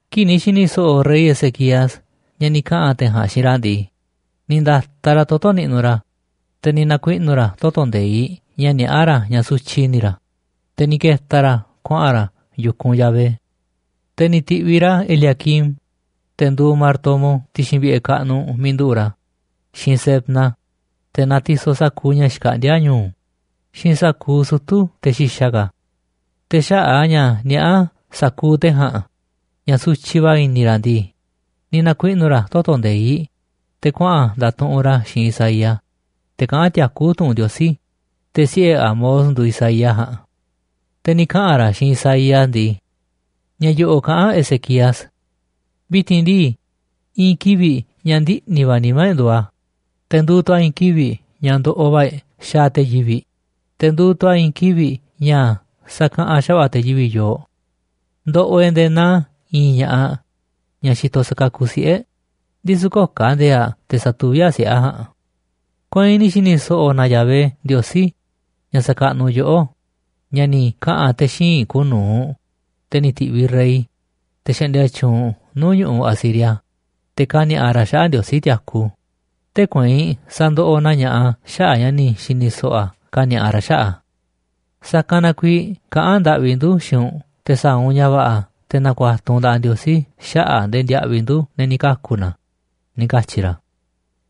Kii̱ꞌ ni̱ xi̱ni̱ so̱ꞌo̱ rey Ezequías ña̱ ni̱ kaꞌa̱n te̱ ja̱a̱nꞌ xiinꞌ ra̱ ndii, ni̱ nda̱taꞌ ra̱ toto̱ niꞌnuꞌ ra̱, te̱ ni̱ na̱kuiꞌnu̱ ra̱ toto̱ nde̱iꞌ ña̱ niaꞌá ra̱ ña̱ sutyiꞌ i̱ni̱ ra̱, te̱ ni̱ ke̱ta̱ ra̱ kuaꞌa̱n ra̱ yu̱kunꞌ Yahvé. Te̱ ni̱ ti̱ꞌviꞌ ra̱ Eliaquim, te̱ nduuꞌ martomo ti̱xi̱n vi̱ꞌe̱ kaꞌnuꞌ miiꞌ nduꞌu̱ꞌ ra̱, xiinꞌ Sebna, te̱ natisoꞌ sa̱kuuꞌ ña̱ xkaꞌndíá ñu̱u̱, xiinꞌ sa̱kuuꞌ sutu̱ te̱ xi̱xa̱ ka̱. Te̱ xaꞌa̱ꞌ a̱ ña̱ niaꞌá sa̱kuuꞌ te̱ ja̱a̱nꞌ ña̱ sutyiꞌ va̱ i̱ni̱ ra̱ ndii, ni̱ na̱kuiꞌnu̱ ra̱ toto̱ nde̱iꞌ, te̱ kuaꞌa̱n nda̱tuꞌunꞌ ra̱ xiinꞌ Isaías, te̱ kaꞌán tiakú tu̱ꞌu̱n Ndiosí, te̱ siꞌe̱ Amoz nduuꞌ Isaías ja̱a̱nꞌ. Te̱ ni̱ kaꞌa̱n ra̱ xiinꞌ Isaías ndii: ―Ña̱ yo̱ꞌo̱ꞌ kaꞌán Ezequías: “Vi̱ti̱n ndii, i̱i̱n kivi̱ꞌ ña̱ ndiꞌni̱ va̱ nimá e̱ꞌ nduuꞌ a̱, te̱ nduuꞌ tu̱ a̱ i̱i̱n kivi̱ꞌ ña̱ ndoꞌoꞌ va̱ e̱ꞌ xaaꞌ te̱ yivi̱ꞌ. Te̱ nduuꞌ tu̱ a̱ i̱i̱n kivi̱ꞌ ña̱ sakaꞌanꞌ xa̱va̱ꞌa̱ te̱ yivi̱ꞌ yooꞌ. Ndoꞌoꞌ e̱ꞌ nde̱e̱ naa i̱i̱n ña̱ꞌaꞌ ña̱ xitoꞌ sakakuꞌ siꞌe̱, ndisu̱ köo̱ꞌ ka̱ ndi̱e̱e̱ꞌ aꞌ te̱ sa̱tuví aꞌ siꞌe̱ aꞌ ja̱a̱nꞌ. Kueinꞌ ni̱ xi̱ni̱ so̱ꞌo̱ na Yahvé Ndiosí, ña̱ xakaꞌnuꞌ yoꞌó, ña̱ ni̱ kaꞌa̱n te̱ xíinꞌ kuuꞌ nu̱uꞌ, te̱ ni̱ ti̱viꞌ rey, te̱ xaꞌndia tyuunꞌ nuu̱ꞌ ñu̱ꞌuꞌ Asiria, te̱ ka̱ni̱a̱ꞌa ra̱ xaꞌa̱ꞌ Ndiosí tiaku. Tee̱ꞌ kueinꞌ sa̱ndoꞌoꞌ na ña̱ꞌaꞌ a̱ xaꞌa̱ꞌ ña̱ ni̱ xi̱ni̱ so̱ꞌo̱ a̱ kani̱a̱ꞌa ra̱ xaꞌa̱ꞌ a̱. Sa̱kanꞌ na kuiiꞌ kaꞌán ndaꞌvi ndu̱ xiinꞌ u̱nꞌ te̱ sa̱a̱ u̱nꞌ ña̱ va̱ꞌa̱ te̱ na̱ku̱a̱tu̱ u̱nꞌ nda̱ꞌaꞌ Ndiosí xaꞌa̱ꞌ ndee ndiaꞌviꞌ ndu̱ te̱ ni̱ kaku̱ na̱”, ―ni̱ katyi̱ ra̱.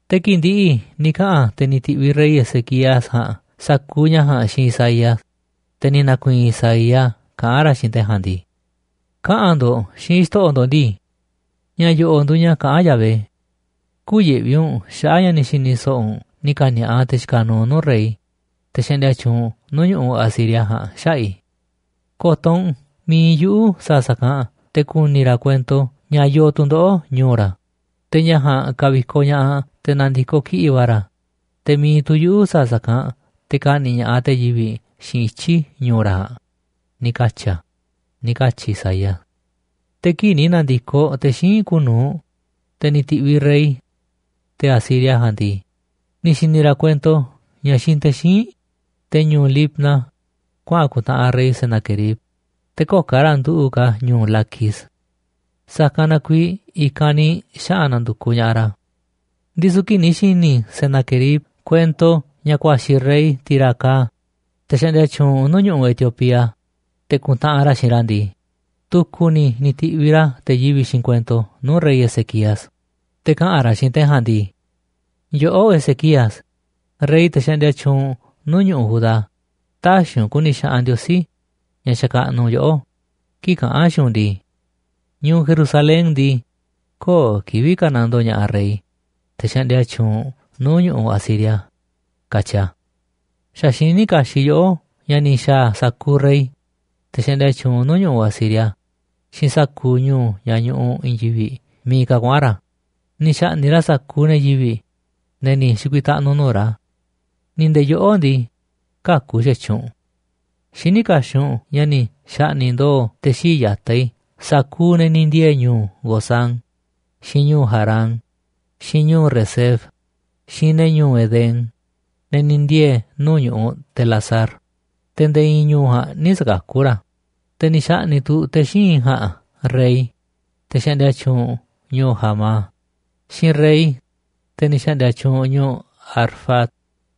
Te̱ kii̱ꞌ ndi̱ꞌi̱ ni̱ kaꞌa̱n te̱ ni̱ ti̱ꞌviꞌ rey Ezequías ja̱a̱nꞌ sa̱kuuꞌ ña̱ ja̱a̱nꞌ xiinꞌ Isaías, te̱ ni̱ na̱ku̱i̱i̱n Isaías kaꞌán ra̱ xiinꞌ te̱ ja̱a̱nꞌ ndii: ―Kaꞌa̱n ndo̱ꞌ xiinꞌ xto̱ꞌo̱ ndo̱ꞌ ndii: “Ña̱ yo̱ꞌo̱ꞌ nduuꞌ ña̱ kaꞌán Yahvé: Kü̱yi̱ꞌvi u̱nꞌ xaꞌa̱ꞌ ña̱ ni̱ xi̱ni̱ so̱ꞌo̱ u̱nꞌ ni̱ ka̱ni̱a̱ꞌa te̱ xikaꞌ nuuꞌ nuu̱ꞌ rey, te̱ xaꞌndia tyuunꞌ nuu̱ꞌ ñu̱ꞌuꞌ Asiria ja̱a̱nꞌ, xaꞌa̱ꞌ i̱. Ko̱to̱ u̱nꞌ, mi̱iꞌ yuꞌu̱ sa̱a̱ sa̱kanꞌ te̱ ku̱ni̱ ra̱ kuento ña̱ yoo tu̱ndoꞌo̱ꞌ ñu̱u̱ ra̱, te̱ ña̱ ja̱a̱nꞌ ka̱vi̱koꞌ ña̱ꞌaꞌ te̱ na̱ndi̱koꞌ kiꞌi̱ꞌ va̱ ra̱. Te̱ mi̱iꞌ tu̱ yuꞌu̱ sa̱a̱ sa̱kanꞌ te̱ ka̱ꞌni̱ꞌ ña̱ꞌaꞌ te̱ yivi̱ꞌ xiinꞌ ityi̱ ñu̱u̱ ra̱ ja̱a̱nꞌ, ni̱ katyi̱ a̱”, ―ni̱ katyi̱ Isaías. Te̱ kii̱ꞌ ni̱ na̱ndi̱koꞌ te̱ xíinꞌ kuuꞌ nu̱uꞌ, te̱ ni̱ ti̱ꞌviꞌ rey, te̱ Asiria ja̱a̱nꞌ ndii, ni̱ xi̱ni̱ ra̱ kuento ña̱ xiinꞌ te̱ xíinꞌ, te̱ ñu̱u̱ Libna, kuaꞌa̱n ku̱ntaꞌanꞌ rey Senaquerib, te̱ köo̱ꞌ ka̱ ra̱ nduꞌu̱ꞌ ka̱ ñu̱u̱ Laquis, sa̱kanꞌ na kuiiꞌ i̱kanꞌ ni̱ xaꞌa̱n na̱ndu̱kuꞌ ña̱ꞌaꞌ ra̱. Ndisu̱ kii̱ꞌ ni̱ xi̱ni̱ Senaquerib kuento ña̱ ku̱a̱xi̱ rey Tirhaca, te̱ xaꞌndia tyuunꞌ nu̱u̱ꞌ ñu̱ꞌuꞌ Etiopía, te̱ ku̱ntaꞌanꞌ ra̱ xiinꞌ ra̱ ndii, tu̱ku̱ ni̱ ni̱ ti̱viꞌ ra̱ te̱ yivi̱ꞌ xiinꞌ kuento nuu̱ꞌ rey Ezequías, te̱ kaꞌa̱n ra̱ xiinꞌ te̱ ja̱a̱nꞌ ndii: “Yoꞌó, Ezequías, rey te̱ xaꞌndia tyuunꞌ nuu̱ꞌ ñu̱ꞌuꞌ Judá, tä̱xi̱ u̱nꞌ ku̱ni̱ xaꞌanꞌ Ndiosí, ña̱ xakaꞌnuꞌ u̱nꞌ, yoꞌó kii̱ꞌ kaꞌán a̱ xiinꞌ u̱nꞌ ndii: Ñu̱u̱ Jerusalén ndii, köo̱ꞌ kivi̱ꞌ ka̱nandoo ña̱ꞌaꞌ rey, te̱ xaꞌndia tyuunꞌ nuu̱ꞌ ñu̱ꞌuꞌ Asiria, katyi a̱. Xa̱ xiní kaxiꞌ yoꞌó ña̱ ni̱ xa̱a̱ sa̱kuuꞌ rey, te̱ xaꞌndia tyuunꞌ nuu̱ꞌ ñu̱ꞌuꞌ Asiria, xiinꞌ sa̱kuuꞌ ñu̱u̱ ña̱ ñuꞌuꞌ nuu̱ꞌ i̱i̱n yivi̱ꞌ miiꞌ ka̱ kuaꞌa̱n ra̱. Ni̱ xa̱ꞌni̱ꞌ ra̱ sa̱kuuꞌ ne̱ yivi̱ꞌ, ne̱ ni̱ xi̱ku̱i̱taꞌnu̱ nuu̱ꞌ ra̱. Ni̱ nde̱e̱ yoꞌó ndii, käku̱ xa̱tyiꞌ u̱nꞌ. Xiní kaxiꞌ u̱nꞌ ña̱ ni̱ xa̱ꞌni̱ꞌ ndo̱o̱ te̱ xii̱ꞌ ya̱taꞌ i̱ sa̱kuuꞌ ne̱ ni̱ ndiee̱ ñu̱u̱ Gozán, xiinꞌ ñu̱u̱ Harán, xiinꞌ ñu̱u̱ Resef, xiinꞌ ne̱ ñu̱u̱ Edén, ne̱ ni̱ ndiee̱ nuu̱ꞌ ñu̱ꞌuꞌ Telasar, te̱ nde̱e̱ i̱i̱n ñu̱u̱ ja̱a̱nꞌ nï̱ sa̱kakú ra̱. Te̱ ni̱ xa̱ꞌni̱ꞌ tu̱ te̱ xíinꞌ i̱ ja̱a̱nꞌ rey, te̱ xa̱ꞌndi̱a̱ tyuunꞌ ñu̱u̱ Hamat, xiinꞌ rey, te̱ ni̱ xa̱ꞌndi̱a̱ tyuunꞌ ñu̱u̱ Arfad,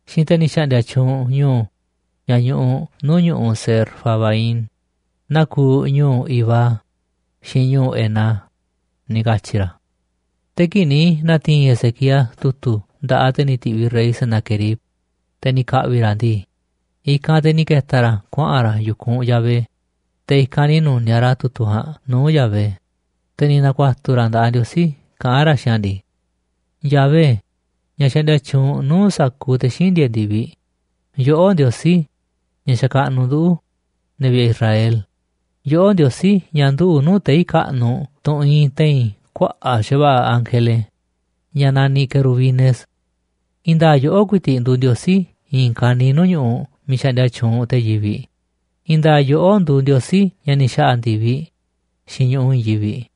xiinꞌ te̱ ni̱ xa̱ꞌndi̱a̱ tyuunꞌ ñu̱u̱ ña̱ ñuꞌuꞌ nuu̱ꞌ ñu̱ꞌuꞌ Sefarvaim, naa kuuꞌ ñu̱u̱ Iva, xiinꞌ ñu̱u̱ Hena”, ni̱ katyi̱ ra̱. Te̱ kii̱ꞌ ni̱ na̱ti̱i̱n Ezequías tu̱tu̱ nda̱ꞌaꞌ te̱ ni̱ ti̱ꞌviꞌ rey Senaquerib, te̱ ni̱ ka̱ꞌvi̱ ra̱ a̱ ndii, i̱kanꞌ te̱ ni̱ ke̱ta̱ ra̱ kuaꞌa̱n ra̱ yu̱kunꞌ Yahvé, te̱ i̱kanꞌ ni̱ nu̱niaꞌ ra̱ tu̱tu̱ ja̱a̱nꞌ nuu̱ꞌ Yahvé, te̱ ni̱ na̱ku̱a̱tu̱ ra̱ nda̱ꞌaꞌ Ndiosí kaꞌán ra̱ xiinꞌ a̱ ndii: ―Yahvé, ña̱ xaꞌndia tyuunꞌ nuu̱ꞌ sa̱kuuꞌ te̱ xíinꞌ ndieeꞌ ndi̱viꞌ, yoꞌó Ndiosí, ña̱ xakaꞌnuꞌ nduꞌu̱, ne̱ vi̱ꞌe̱ Israel, yoꞌó Ndiosí, ña̱ nduꞌu̱ꞌ nuu̱ꞌ tei̱ kaꞌnuꞌ, tunꞌ iinꞌ te̱i̱n kuaꞌa̱ꞌ xa̱va̱ꞌa̱ ángele ña̱ naniꞌ querubines. I̱i̱n nda̱a̱ꞌ yoꞌó ku̱i̱ti̱ꞌ nduuꞌ Ndiosí i̱i̱n kaniiꞌ nuu̱ꞌ ñu̱ꞌuꞌ miiꞌ xaꞌndia tyuunꞌ te̱ yivi̱ꞌ. I̱i̱n nda̱a̱ꞌ yoꞌó nduuꞌ Ndiosí ña̱ ni̱ xa̱ꞌa̱ ndi̱viꞌ xiinꞌ ñu̱ꞌuꞌ i̱i̱n yivi̱ꞌ.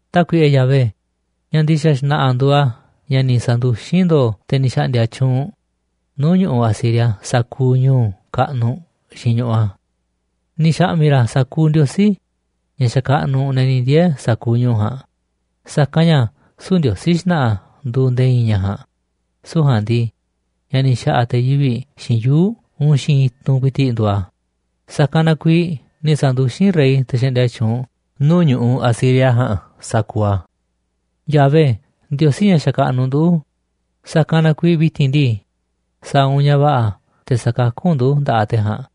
Tákuiꞌe Yahvé, ña̱ ndi̱xa̱ xna̱ꞌa̱ nduuꞌ a̱ ña̱ ni̱ sa̱nduxín ndo̱o̱ te̱ ni̱ xaꞌndia tyuunꞌ nuu̱ꞌ ñu̱ꞌuꞌ Asiria sa̱kuuꞌ ñu̱u̱ kaꞌnuꞌ xiinꞌ ñu̱ꞌuꞌ a̱. Ni̱ xa̱ꞌmi̱ ra̱ sa̱kuuꞌ ndiosí ña̱ xakaꞌnuꞌ ne̱ ni̱ ndiee̱ sa̱kuuꞌ ñu̱u̱ ja̱a̱nꞌ, sa̱kanꞌ ña̱ süu̱ꞌ ndiosí xna̱ꞌa̱ nduuꞌ nde̱e̱ i̱i̱n ña̱ ja̱a̱nꞌ, süu̱ꞌ ja̱a̱nꞌ ndii, ña̱ ni̱ xa̱ꞌa̱ te̱ yivi̱ꞌ xiinꞌ yuu̱ꞌ uun xiinꞌ i̱tunꞌ ku̱i̱ti̱ꞌ nduuꞌ a̱. Sa̱kanꞌ na kuiiꞌ ni̱ sa̱nduxín rey, te̱ xaꞌndia tyuunꞌ nuu̱ꞌ ñu̱ꞌuꞌ Asiria ja̱a̱nꞌ, sa̱kuuꞌ a̱. Yahvé, Ndiosí ña̱ xakaꞌnuꞌ ndu̱, sa̱kanꞌ na kuiiꞌ vi̱ti̱n ndii, sa̱a̱ u̱nꞌ ña̱ va̱ꞌa̱ te̱ sa̱kakú u̱nꞌ ndu̱ nda̱ꞌaꞌ te̱ ja̱a̱nꞌ,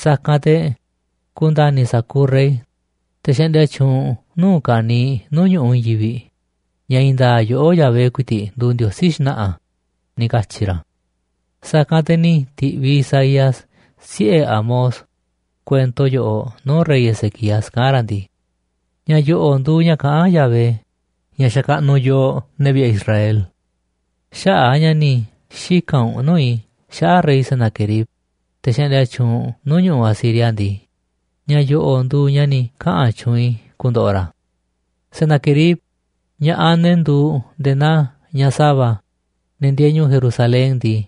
sa̱kanꞌ te̱ ku̱nda̱ni̱ sa̱kuuꞌ rey, te̱ xaꞌndia tyuunꞌ nuu̱ꞌ ka̱niiꞌ nuu̱ꞌ ñu̱ꞌuꞌ i̱i̱n yivi̱ꞌ, ña̱ i̱i̱n nda̱a̱ꞌ yoꞌó Yahvé ku̱i̱ti̱ꞌ nduuꞌ Ndiosí xna̱ꞌa̱ ―ni̱ katyi̱ ra̱. Sa̱kanꞌ te̱ ni̱ ti̱ꞌviꞌ Isaías, siꞌe̱ Amoz, kuento yoꞌoꞌ nuu̱ꞌ rey Ezequías, kaꞌán ra̱ ndii: ―Ña̱ yo̱ꞌo̱ꞌ nduuꞌ ña̱ kaꞌán Yahvé, ña̱ xakaꞌnuꞌ yooꞌ ne̱ vi̱ꞌe̱ Israel: “Xaꞌa̱ꞌ a̱ ña̱ ni̱ xika̱n u̱nꞌ nuu̱ꞌ i̱ xaꞌa̱ꞌ rey, Senaquerib, te̱ xaꞌndia tyuunꞌ nuu̱ꞌ ñu̱ꞌuꞌ Asiria ndii, ña̱ yo̱ꞌo̱ꞌ nduuꞌ ña̱ ni̱ kaꞌa̱n tyuunꞌ i̱ ku̱ndo̱ꞌo̱ ra̱: Senaquerib, ña̱ꞌaꞌ ne̱ nduuꞌ nde̱e̱ naa ñaꞌ sa̱va̱, ne̱ ndieeꞌ ñu̱u̱ Jerusalén ndii,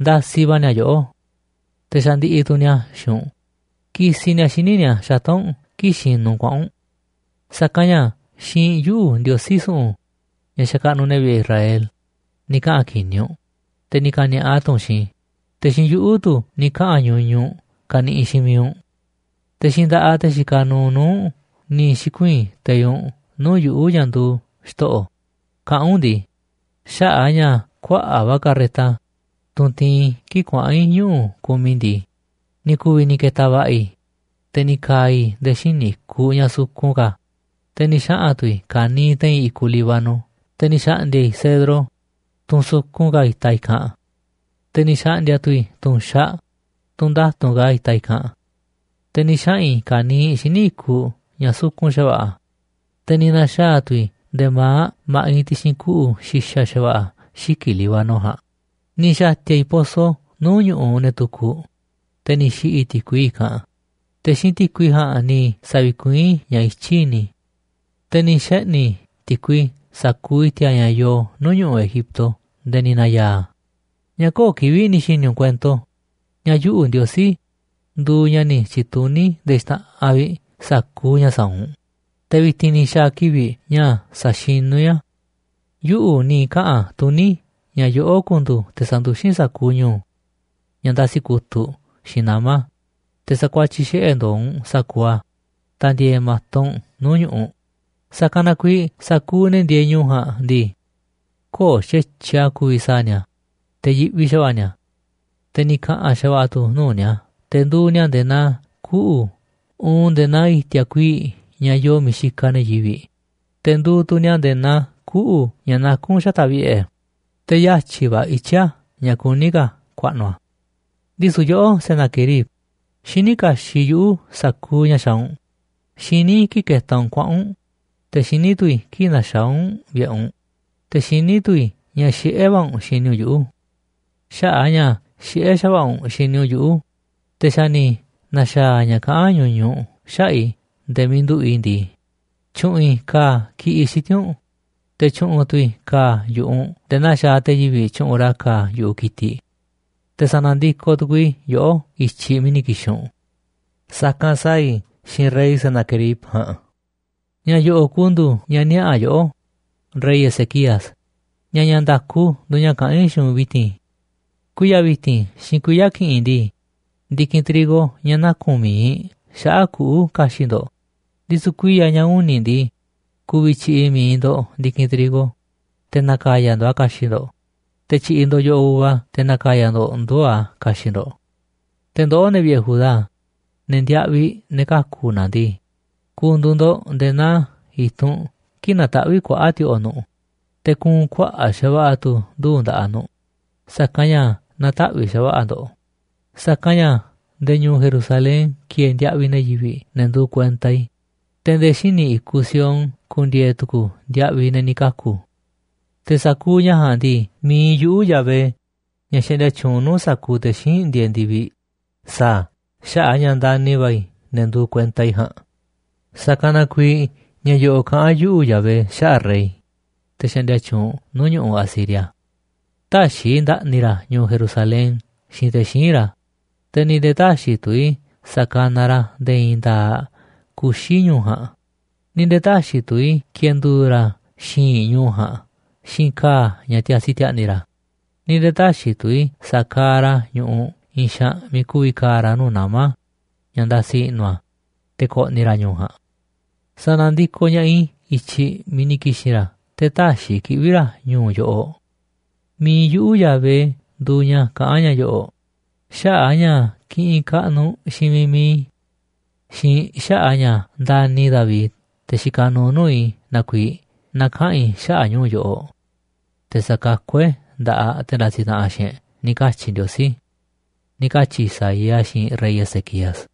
ndasiꞌ va̱ ni̱a̱ yoꞌó. Te̱ xandiꞌiꞌ tu̱ ni̱a̱ xiinꞌ u̱nꞌ kisiꞌ ni̱a̱ xíniꞌ ni̱a̱ xata̱ꞌ u̱nꞌ kii̱ꞌ xinuꞌ u̱nꞌ kuaꞌa̱n u̱nꞌ. Sa̱kanꞌ ña̱ xiinꞌ yuꞌu̱, Ndiosí su̱ꞌu̱n, ña̱ xakaꞌnuꞌ ne̱ vi̱ꞌe̱ Israel, ni̱ kaꞌa̱n ki̱ni̱ u̱nꞌ, te̱ ni̱ ka̱ni̱a̱ꞌa tu̱ u̱nꞌ xiinꞌ i̱, te̱ xiinꞌ yuꞌu̱ tu̱ ni̱ kaꞌa̱n ñuñuꞌ u̱nꞌ kaniꞌiꞌ xiinꞌ miiꞌ u̱nꞌ. Te̱ xiinꞌ nda̱ꞌaꞌ te̱ xikaꞌ nuuꞌ nuu̱ꞌ u̱nꞌ ni̱ xi̱kuii̱n teiꞌ u̱nꞌ nuu̱ꞌ yuꞌu̱, ña̱ nduuꞌ Xto̱ꞌo̱, kaꞌán u̱nꞌ ndii: Xaꞌa̱ꞌ a̱ ña̱ kuaꞌa̱ꞌ va̱ carreta, tunꞌ tiinꞌ i̱ kii̱ꞌ kuaꞌa̱n i̱ ñuꞌu̱ kumiꞌ i̱ ndii, ni̱ ku̱vi̱ ni̱ ke̱ta̱ va̱ꞌa̱ i̱, te̱ ni̱ ka̱a̱ i̱ nde̱e̱ xíniꞌ i̱kuꞌ ña̱ sukun ka̱, te̱ ni̱ xaꞌa̱n tu̱ i̱ ka̱niiꞌ te̱i̱n i̱kuꞌ Líbano. Te̱ ni̱ xa̱ꞌndi̱a̱ i̱ cedro, tunꞌ sukun ka̱ itaꞌ i̱kanꞌ, te̱ ni̱ xa̱ꞌndi̱a̱ tu̱ i̱ tu̱nxaꞌ, tunꞌ nda̱tu̱nꞌ ka̱ itaꞌ i̱kanꞌ. Te̱ ni̱ xaꞌa̱n i̱ ka̱niiꞌ xíniꞌ i̱kuꞌ ña̱ sukun xa̱va̱ꞌa̱, te̱ ni̱ na̱xaa̱ tu̱ i̱ nde̱e̱ ma̱aꞌ ma̱ꞌiꞌ ti̱xi̱n kuꞌu̱ xi̱xa̱ xa̱va̱ꞌa̱ xiki̱ꞌ Líbano ja̱a̱nꞌ. Ni̱ xa̱ti̱a̱ i̱ poso nuu̱ꞌ ñu̱ꞌuꞌ ne̱ tukuꞌ, te̱ ni̱ xi̱ꞌi̱ i̱ ti̱kui i̱kanꞌ, te̱ xiinꞌ ti̱kui ja̱a̱nꞌ ni̱ sa̱vi̱kuiín i̱ ña̱ i̱tyiꞌ i̱ni̱ i̱. Te̱ ni̱ xeꞌni̱ i̱ ti̱kui sa̱kuuꞌ i̱ti̱a̱ ña̱ yoo nuu̱ꞌ ñu̱ꞌuꞌ Egipto nde̱e̱ ni̱ na̱ya̱a̱ a̱. ’¿Ña̱ köo̱ꞌ kivi̱ꞌ ni̱ xi̱ni̱ u̱nꞌ kuento ña̱ yuꞌu̱, Ndiosí, nduuꞌ ña̱ ni̱ tyi̱tuní nde̱e̱ xta̱ꞌanꞌ vi̱ꞌ sa̱kuuꞌ ña̱ sa̱a̱ u̱nꞌ? Te̱ vi̱ti̱n ni̱ xa̱a̱ kivi̱ꞌ ña̱ sa̱xinu̱ i̱ a̱. Yuꞌu̱ ni̱ kaꞌa̱n tuní ña̱ yoꞌó ku̱ndu̱u̱ te̱ sa̱nduxín sa̱kuuꞌ ñu̱u̱ ña̱ ndasi kutu̱ꞌ xiinꞌ nama̱, te̱ sa̱kuatyiꞌ xiꞌe̱ ndo̱o̱ u̱nꞌ sa̱kuuꞌ a̱ ta̱ndi̱e̱e̱ ma̱to u̱nꞌ nuu̱ꞌ ñu̱ꞌuꞌ. Sa̱kanꞌ na kuiiꞌ sa̱kuuꞌ ne̱ ndieeꞌ ñu̱u̱ ja̱a̱nꞌ ndii, köo̱ꞌ xa̱tyiꞌ a̱ ku̱vi̱ sa̱a̱ ni̱a̱, te̱ yiꞌvi xa̱va̱ꞌa̱ ni̱a̱, te̱ ni̱ ka̱ꞌa̱n xa̱va̱ꞌa̱ tu̱ nuu̱ꞌ ni̱a̱. Te̱ nduuꞌ ni̱a̱ nde̱e̱ naa kuꞌu̱ uun nde̱e̱ naa i̱ti̱a̱ kuii̱ꞌ ña̱ yoo miiꞌ xikaꞌ ne̱ yivi̱ꞌ. Te̱ nduuꞌ tu̱ ni̱a̱ nde̱e̱ naa kuꞌu̱ ña̱ nakún xata̱ꞌ vi̱ꞌe̱, te̱ yatyi̱ va̱ ityí a̱ ña̱ kuní ka̱ ku̱a̱ꞌnu̱ a̱. ’Ndisu̱ yoꞌó, Senaquerib, xiní kaxiꞌ yuꞌu̱ sa̱kuuꞌ ña̱ xaaꞌ u̱nꞌ. Xiní i̱ kii̱ꞌ ketaꞌ u̱nꞌ kuaꞌa̱n u̱nꞌ, te̱ xiní tu̱ i̱ kii̱ꞌ naxaá u̱nꞌ vi̱ꞌe̱ u̱nꞌ, te̱ xiní tu̱ i̱ ña̱ xiꞌé va̱ u̱nꞌ xini u̱nꞌ yuꞌu̱. Xaꞌa̱ꞌ a̱ ña̱ xiꞌé xa̱va̱ꞌa̱ u̱nꞌ xini u̱nꞌ yuꞌu̱, te̱ xa̱ ni̱ na̱xa̱a̱ ña̱ kaꞌán ñuñuꞌ u̱nꞌ xaꞌa̱ꞌ i̱ nde̱e̱ miiꞌ nduꞌu̱ꞌ i̱ ndii, tyu̱ꞌu̱n i̱ ka̱a̱ ki̱ꞌiꞌ xiti̱nꞌ u̱nꞌ, te̱ tyu̱ꞌu̱n tu̱ i̱ ka̱a̱ yu̱ꞌuꞌ u̱nꞌ nde̱e̱ naa xaaꞌ te̱ yivi̱ꞌ tyuꞌunꞌ ra̱ ka̱a̱ yu̱ꞌuꞌ ki̱tiꞌ. Te̱ sa̱na̱ ndikoꞌ tu̱ku̱u̱ i̱ yoꞌó i̱tyiꞌ miiꞌ ni̱ ki̱xi̱n u̱nꞌ, sa̱kanꞌ sa̱a̱ i̱ xiinꞌ rey Senaquerib ja̱a̱nꞌ. ’Ña̱ yo̱ꞌo̱ꞌ ku̱ndu̱u̱ ña̱ niaꞌa̱ yoꞌó, rey Ezequías, ña̱ ña̱ nda̱ku nduuꞌ ña̱ kaꞌán i̱ xiinꞌ u̱nꞌ vi̱ti̱n. Kuiya̱ vi̱ti̱n xiinꞌ kuiya̱ ki̱ꞌi̱n ndii, ndi̱kinꞌ trigo ña̱ naku̱n mi̱iꞌ xaꞌa̱ꞌ kuꞌu̱ ka̱xi̱ꞌ ndo̱ꞌ, ndisu̱ kuiya̱ ña̱ uni̱ ndii, ku̱vi̱ tyi̱ꞌi̱ mi̱iꞌ ndo̱ꞌ ndi̱kinꞌ trigo, te̱ na̱ka̱ya̱ ndo̱ꞌ a̱ ka̱xi̱ꞌ ndo̱ꞌ, te̱ tyi̱ꞌi̱ ndo̱ꞌ yo̱ꞌoꞌ uva te̱ na̱ka̱ya̱ ndo̱ꞌ nduu̱ꞌ a̱ ka̱xi̱ꞌ ndo̱ꞌ. Te̱ ndoꞌó, ne̱ vi̱ꞌe̱ Judá, ne̱ ndiaꞌviꞌ ne̱ kaku̱ na̱ ndii, ku̱ndu̱u̱ ndo̱ꞌ nde̱e̱ naa i̱tunꞌ kii̱ꞌ nataꞌvíꞌ kuaꞌa̱ꞌ ti̱o̱ꞌo̱ nu̱ꞌ, te̱ kuunꞌ kuaꞌa̱ꞌ xa̱va̱ꞌa̱ tu̱ nduu̱ꞌ nda̱ꞌaꞌ nu̱ꞌ, sa̱kanꞌ ña̱ na̱taꞌvi̱ꞌ xa̱va̱ꞌa̱ ndo̱ꞌ. Sa̱kanꞌ ña̱ nde̱e̱ ñu̱u̱ Jerusalén ki̱e̱e̱ ndiaꞌviꞌ ne̱ yivi̱ꞌ, ne̱ nduuꞌ kuenta i̱, te̱ nde̱e̱ xíniꞌ i̱kuꞌ Sion ku̱ndi̱e̱e̱ tu̱ku̱ ndiaꞌviꞌ ne̱ ni̱ kaku̱. Te̱ sa̱kuuꞌ ña̱ ja̱a̱nꞌ ndii, mi̱iꞌ yuꞌu̱, Yahvé, ña̱ xaꞌndia tyuunꞌ nuu̱ꞌ sa̱kuuꞌ te̱ xíinꞌ ndieeꞌ ndi̱viꞌ, sa̱a̱ a̱ xaꞌa̱ꞌ a̱ ña̱ ndani̱ va̱ i̱ ne̱ nduuꞌ kuenta i̱ ja̱a̱nꞌ. ’Sa̱kanꞌ na kuiiꞌ ña̱ yo̱ꞌo̱ꞌ kaꞌán yuꞌu̱, Yahvé, xaꞌa̱ꞌ rey, te̱ xaꞌndia tyuunꞌ nuu̱ꞌ ñu̱ꞌuꞌ Asiria: Tä̱xi̱ i̱ nda̱ꞌni̱ ra̱ ñu̱u̱ Jerusalén xiinꞌ te̱ xíinꞌ ra̱, te̱ ni̱ nde̱e̱ tä̱xi̱ tu̱ i̱ sa̱kanaꞌ ra̱ nde̱e̱ i̱i̱n nda̱a̱ꞌ kuxi̱ ñu̱u̱ ja̱a̱nꞌ, ni̱ nde̱e̱ tä̱xi̱ tu̱ i̱ ki̱e̱ndu̱u̱ ra̱ xi̱i̱nꞌ ñu̱u̱ ja̱a̱nꞌ xiinꞌ ka̱a̱ ña̱ tiasi ti̱a̱ꞌni̱ ra̱, ni̱ nde̱e̱ tä̱xi̱ tu̱ i̱ sa̱kaaꞌ ra̱ ñu̱ꞌuꞌ i̱i̱n xaanꞌ miiꞌ ku̱vi̱ ka̱a̱ ra̱ nuu̱ꞌ nama̱ ña̱ ndasi i̱ꞌnu̱ a̱, te̱ ko̱ꞌni̱ ra̱ ñu̱u̱ ja̱a̱nꞌ. Sa̱na̱ndikoꞌ ña̱ꞌaꞌ i̱ i̱tyiꞌ miiꞌ ni̱ ki̱xi̱n ra̱, te̱ tä̱xi̱ i̱ kiꞌvi̱ ra̱ ñu̱u̱ yoꞌoꞌ. Mi̱iꞌ yuꞌu̱ Yahvé nduuꞌ ña̱ kaꞌán ña̱ yo̱ꞌo̱ꞌ. Xaꞌa̱ꞌ a̱ ña̱ kiꞌinꞌ kaꞌnuꞌ xiinꞌ miiꞌ mi̱iꞌ i̱ xiinꞌ xaꞌa̱ꞌ a̱ ña̱ ndani̱ i̱ David, te̱ xikaꞌ nuuꞌ nuu̱ꞌ i̱ na kuiiꞌ, na̱kaꞌa̱n i̱ xaꞌa̱ꞌ ñu̱u̱ yoꞌoꞌ, te̱ sa̱kakú e̱ꞌ nda̱ꞌaꞌ te̱ ndasiꞌ taꞌanꞌ xiinꞌ e̱ꞌ, ni̱ katyi̱ Ndiosí” ―ni̱ katyi̱ Isaías xiinꞌ rey Ezequías.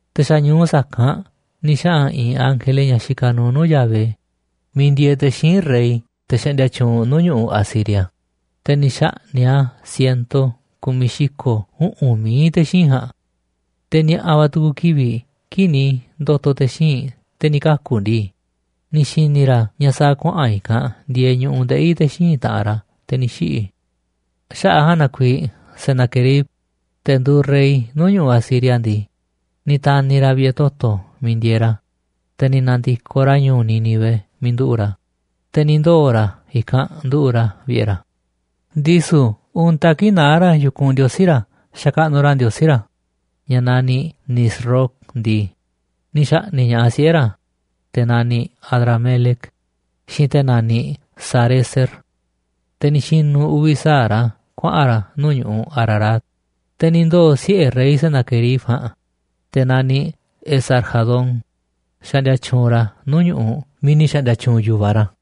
Te̱ xa̱ ñu̱u sa̱kanꞌ ni̱ xaꞌa̱n i̱i̱n ángele, ña̱ xikaꞌ nuuꞌ nuu̱ꞌ Yahvé, miiꞌ ndieeꞌ te̱ xíinꞌ rey, te̱ xaꞌndia tyuunꞌ nuu̱ꞌ ñu̱ꞌuꞌ Asiria, te̱ ni̱ xa̱ꞌni̱ꞌ a̱ siento ku̱miꞌ xi̱ko̱ uꞌu̱n mií te̱ xíinꞌ ja̱a̱nꞌ. Te̱ ni̱a̱ꞌa̱ va̱ tu̱ku̱ kivi̱ꞌ kii̱ꞌ ni̱ ndo̱to̱ te̱ xíinꞌ te̱ ni̱ kaku̱ ndii, ni̱ xi̱ni̱ ra̱ ña̱ sa̱a̱ kuaꞌa̱n i̱kanꞌ ndieeꞌ ñu̱ꞌuꞌ ndeꞌi̱ te̱ xíinꞌ taꞌanꞌ ra̱, te̱ ni̱ xiꞌi̱. Xaꞌa̱ꞌ a̱ ja̱a̱nꞌ na kuiiꞌ Senaquerib, te̱ nduuꞌ rey nuu̱ꞌ ñu̱ꞌuꞌ Asiria ndii, ni̱ ta̱ni̱ ra̱ vi̱ꞌe̱ toto̱ miiꞌ ndieeꞌ ra̱, te̱ ni̱ na̱ndi̱koꞌ ra̱ ñu̱u̱ Nínive miiꞌ nduꞌu̱ꞌ ra̱, te̱ ni̱ ndoo̱ ra̱ i̱kanꞌ nduꞌu̱ꞌ ra̱ vi̱ꞌe̱ ra̱. Ndisu̱ untaꞌ kii̱ꞌ naá ra̱ yu̱kunꞌ xakaꞌnuꞌ ra̱ ndiosí ra̱ ña̱ naniꞌ Nisroc ndii, ni̱ xa̱ꞌni̱ꞌ ña̱ꞌaꞌ siꞌe̱ ra̱, te̱ naniꞌ Adramelec, xiinꞌ te̱ naniꞌ Sarezer, te̱ ni̱ xi̱nu̱ uvi̱ sa̱aꞌ ra̱ kuaꞌa̱n ra̱ nuu̱ꞌ ñu̱ꞌuꞌ Ararat. Te̱ ni̱ ndoo̱ siꞌe̱ rey Senaquerib ja̱a̱nꞌ, te̱ naniꞌ Esar-hadón, xaꞌndia tyuunꞌ ra̱ nuu̱ꞌ ñu̱ꞌuꞌ miiꞌ ni̱ xa̱ꞌndi̱a̱ tyuunꞌ yu̱va raꞌ.